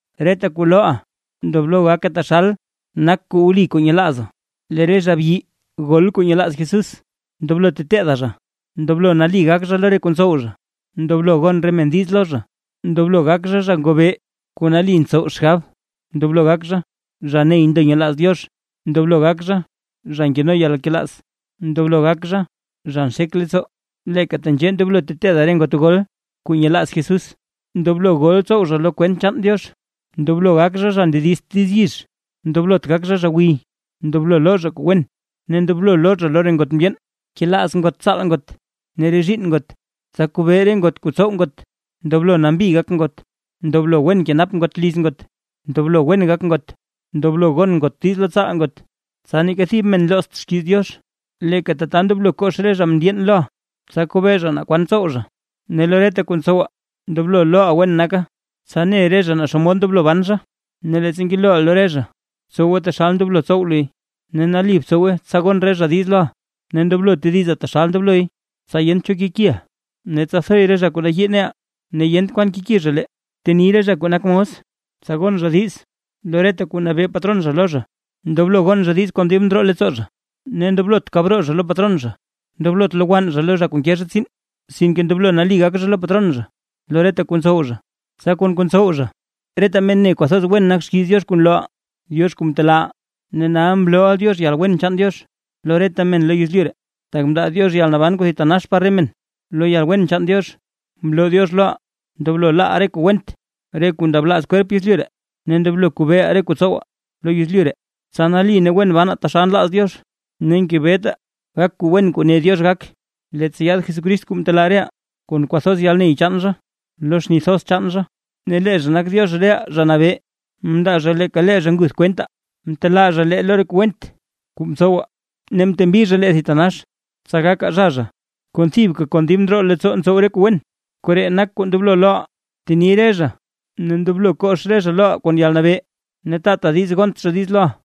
Reta kuu looʼa ndoblo gake taxal nak kuu wli kuu nyelaazaa. Lee re zha byi gol kuu nyelaaz Jesús, ndoblo teteeda zha: ndoblo nali gak zha lo re kuu ntsow zha, ndoblo gon re men diiz lo zha, ndoblo gak zha, zha ngobee kuu nali ntsow xgab, ndoblo gak zha, zha ney ndo nyelaaz Diox, ndoblo gak zha, zha nkeno yalnkelaaz, ndoblo gak zha, zha nxek leettsoo. Leeka tenzhee ndoblo teteeda re ngot gol kuu nyelaaz Jesús: ndoblo gol tsow zha lo kwent chaan Diox, ndoblo gak zha, zha ndedizt diiz yizh, ndoblot gak zha, zha gwiy, ndoblo loo zha kuu wen, ne ndoblo loo zha lo re ngot mndyeen, kelaaz ngot tsaal ngot ne re zhiinn ngot, tsa kobee re ngot re kuu tsow ngot, ndoblo nambi gak ngot, ndoblo wen kenap ngot liz ngot, ndoblo wen gak ngot, ndoblo gon ngot diiz lo tsaal ngot. Tsa neeka thib men loozt xkiiz Diox. Leeka tata ndoblo kox re zha mndyeen loʼa, tsa kobee zha naa kwan ntsow zha. Ne lo reta kuu ntsowa ndoblo looʼa wen naka, tsa ne re zha naa xomod ndoblo ban zha. Ne leettsa ngelooʼa lo re zha, btsowe taxal ndoblo tsow luy, ne nali btsowe tsa gon re zha diiz loʼa. Ne ndoblo tediza taxal ndobloy, tsa yent cho kekiʼa, ne tsa thoy re zha kuu nayii neʼaa ne yent kwan keki zha lee. Bteni re zha kuu nak mos, tsa gon zha diiz lo reta kuu nabee patron zha lo zha, ndoblo gon zha diiz kon dib ndroo leettsoo zha, ne ndoblot kab roo zha lo patron zha. Ndoblot lowann zha lo zha kuu nke zha tsiin, sinke ndoblo nali gak zha lo patron zha lo reta kuu ntsow zha, tsa kon kuu ntsow zha reta men ne kwathoz wen nak xkiiz Diox kuu nlooʼaa; Diox kuu mtelaaʼaa. Ne nal mlooʼa Diox yalwen chaan Diox lo reta men lo yezlyu ree, tak mndaa Diox yalnaban kuu thitanax par re men. Lo yalwen chaan Diox, mloo Diox loʼaa ndoblo laaʼaa re kuu went, re kuu ndablaaz kwerp yezlyu ree; ne ndoblo kobeeʼaa re kuu tsowaa lo yezlyu ree, tsa nali ne wen banaa taxal nlaaz Diox. Ne ngebetaa gak kuu wen kuu ne Diox gak, leettsa yaad Jesucrist kuu mtelaa reʼaa kon kwathoz yalney chaan zha lo xni thoz chaan zha, ne lee zha nak Diox reʼaa Zha Nabee. Mndaa zha leeka lee zha nguth zha kwentaa, mtelaa zha lee lo re kuu went kuu mtsowaa ne mtembi zha lee thitanax, tsa gakaa zha zha, kuu thibka kon dib ndroo leettsoo ntsow re kuu wen. Koree nak kuu ndoblo looʼa, bteni re zha ne ndoblo kox re zha loʼa kon yalnabee. Ne taata diiz gont zha diiz loʼa.